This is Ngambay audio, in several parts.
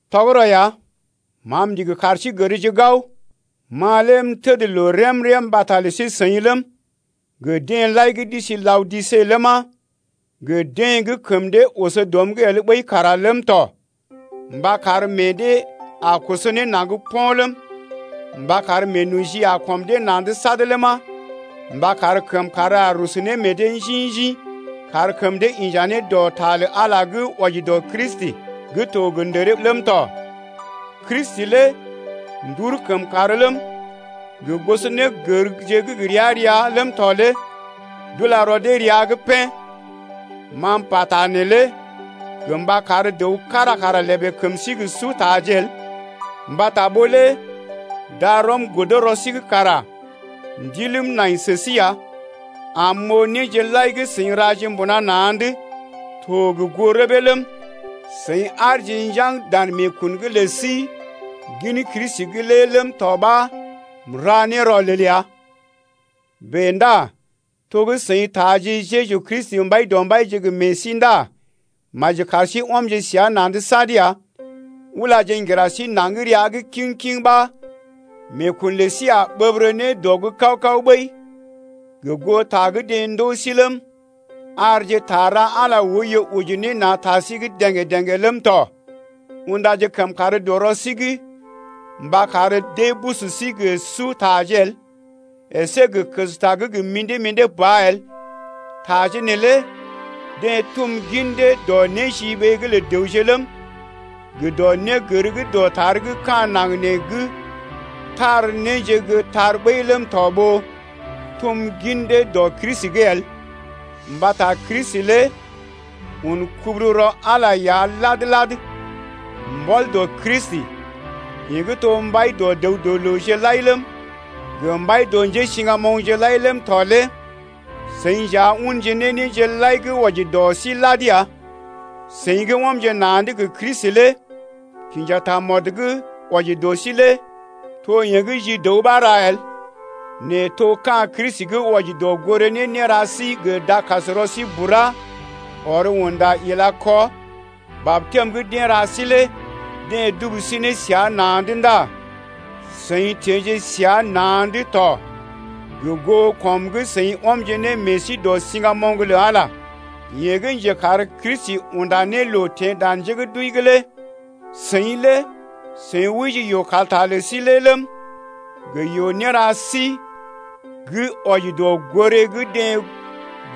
Tɔgərɔ ya, ma m’ndigi kar sí gərje gao, ma lé m’təd loo rém-rém mbata lə sí-seḭ ləm, gə deḛ lai gə́ d’isi Laodise ləma, gə deḛ gə́ kəm dee oso dɔm’g el ɓəi kara ləm tɔ mba kar meḛ dee a koso ne naŋg po̰ ləm, mba kar meenoji a kɔm dee na̰’d sad ləma, mba kar kəmkàr a rusu ne meḛ dee njḭ-njḭ kar kəm dee inja ne dɔ ta lə Ala gə́ wɔji dɔ Kristi gə́ to gə ndəree ləm tɔ. Kristi lé ndur kəmkàr ləm, gə gosɔnégərje gə́ gə ria-ria ləm tɔ lé d’ula rɔ dee rəa’g pḛ́. Ma m’pata neelé gə mba kar dəw kára kara lèbè kəm sí gə sutaje el. Mbata ɓó lé darɔm godo rɔ sí’g kara ndiləm nai sə sí ya, am m’oo néje lai gə́ seḭ raje mbuna na̰’d to gə goo rəbee ləm, seḭ aarje njaŋg dan meekun’g lə sí gin Kristi’g lé ləm tɔ ɓa m’ra ne rɔlel ya. Bèe ndá to gə́ seḭ taaje Jeju Kristi Mbaidɔmbaije gə meḛ sí ndá maji kar sí ɔmje səa na̰’d sad ya. Ulaje ŋgira sí naŋg rəa’g kiŋ-kiŋ, ɓa meekun lə sí a ɓəbərə ne dɔ’g kaw-kaw ɓəi gə goo ta gə́ deḛ ndoo sí ləm, arje ta ra Ala oiyo oji ne na̰ ta sí’g dḛ̀gé-dḛ̀gé ləm tɔ. Undaje kəmkàr dɔ rɔ sí’g mba kar dee busu sí gə sutaje el əsé gə kəsta gə́ gə mḭdé-mḭdé ba el. Taje neelé deḛ dum gin dee dɔ néjiɓee’g lə dəwje ləm, gə dɔ négər gə́ dɔtar gə́ ka̰ naŋg nee gə́ tar néje gə́ tar ɓəi ləm tɔ ɓó tum gin dee dɔ Kristi’g el. Mbata Kristi lé un kubururɔ Ala ya lad-lad. Mbɔl dɔ Kristi, yeḛ gə́ to mbai dɔ dəw-dɔ-looje lai ləm, gə mbai dɔ njésiŋgamoŋje lai ləm tɔ lé seḭ nja unje ne néje lai gə́ wɔji dɔ sí lad ya. Seḭ gə́ ɔmje na̰’d gə Kristi lé kinja tamɔd gə́ wɔji dɔ sí lé to yeḛ gə́ ji dəw ɓa ra el, nɛ to ka̰ Kristi gə́ wɔji dɔ goré ne néra sí gə dakasrɔ sí bura, ɔr unda ila kɔ. Batɛm gə́ deḛ ra sí lé deḛ dubu sí ne səa na̰’d ndá seḭ teḛje səa na̰’d to gə goo kɔm gə́ seḭ ɔmje ne meḛ sí dɔ siŋgamoŋ lə Ala, yeḛ gə́ njekar Kristi unda ne loo teḛ dan njé gə́ d’wəi’g lé. Seḭ lé seḭ wəije yoo-kalta lə sí lé ləm, gə yoo-néra sí gə́ wɔji dɔ goré gə́ deḛ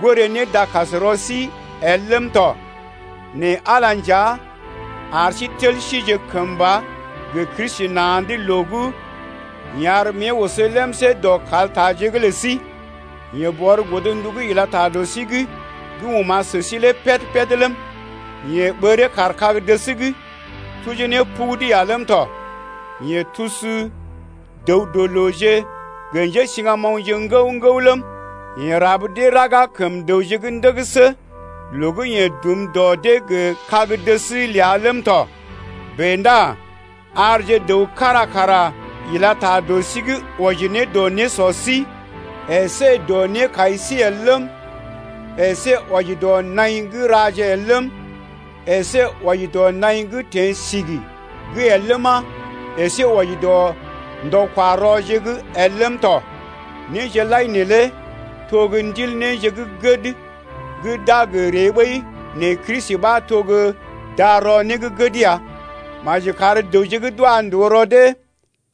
goré ne dakasrɔ sí el ləm tɔ nɛ Ala nja ar sí tel sije kəmba gə Kristi na̰’d loo gə́ yeḛ ar mée oso lemsé dɔ kaltaje’g lə sí. Yeḛ bɔr godndu gə́ ila ta dɔ sí’g gə́ oma̰ sə sí lé pəd-pəd ləm, yeḛ ɓəree kaar kag-dəs’g tujee ne pugudu ya ləm tɔ. Yeḛ tusu dəw-dɔ-looje gə njésiŋgamoŋje ŋgəw-ŋgəw ləm, yeḛ rab dee raga kəm dəwje’g ndəgəsə loo gə́ yeḛ dum dɔ dee gə kag-dəs ləa ləm tɔ. Bèe ndá arje dəw kára kara ila ta dɔ sí’g wɔji ne dɔ nésɔ sí əsé dɔ nékai sí el ləm, əsé wɔji dɔ naḭ gə́ raje el ləm, əsé wɔji dɔ naḭ gə́ teḛ sigi’g el ləma, əsé wɔji dɔ ndɔ-kwa-rɔje’g lé el ləm tɔ. Néje lai neelé to gə́ ndil néje gə́ gəd gə́ d’a gə ree ɓəi nɛ Kristi ɓa to gə́ darɔ né gə́ gəd ya. Maji kar dəwje gə́ d’wa ndòo rɔ dee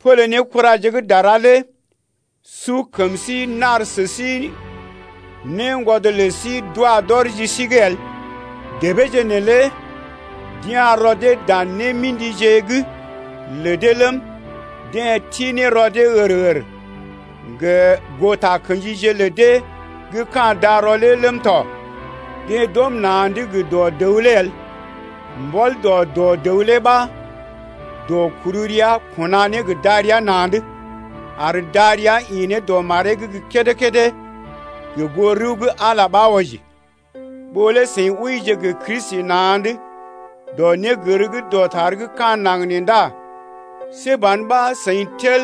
pole ne kuraje gə́ kára lé su kəm sí nar sə sí néngwɔd lə sí d’wa d’ɔr ji sí’g el. Débeeje neelé d’ya̰ rɔ dee dan némḭdije’g lə dee ləm, deḛ ti ne rɔ dee hər-hər gə goo takə̰jije lə dee gə́ ka̰ darɔ lé ləm tɔ. Deḛ d’ɔm na̰’d gə dɔ dəw lé el. Mbɔl dɔ dɔ dəw lé ɓa dɔ-kuru-rəa kuna ne gə darəa na̰’d, ar darəa ḭ ne dɔ maree’g gə́ kédé-kédé gə goo rəw gə́ Ala ɓa wɔji. Ɓó lé seḭ wəije gə Kristi na̰’d dɔ négər gə́ dɔtar gə́ ka̰ naŋg nee ndá see ban ɓa seḭ tel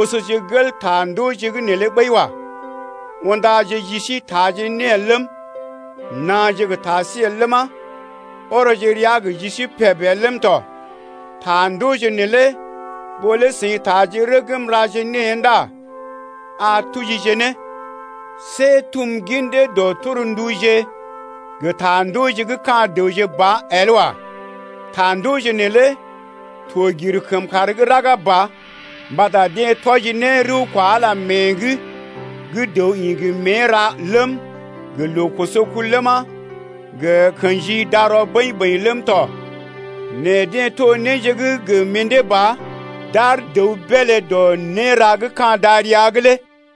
osoje gel ta ndooje’g neelé ɓəi wa. Undaje ji sí taaje né el ləm, naaje gə ta sí el ləma, ɔrɔje rəa gə ji sí peb el ləm tɔ. Ta ndooje neelé ɓó lé taaje rəgm raje née ndá a tujije ne. See tum gin dee dɔ ne tornduje gə ta ndooje gə́ ka̰ dəwje ba el wa. Ta ndooje neelé to gir kəmkàr gə́ raga ba mbata deḛ tɔji ne rəw kwa Ala mée’g gə́ dəw ḭ gə mée ra ləm, gə loo koso kul ləma, gə kḛji darɔ bəḭ-bəḭ ləm tɔ nɛ deḛ to néje gə mḭdé ba gə́ d’ar dəw beelé dɔ néra gə́ ka̰ darəa’g lé.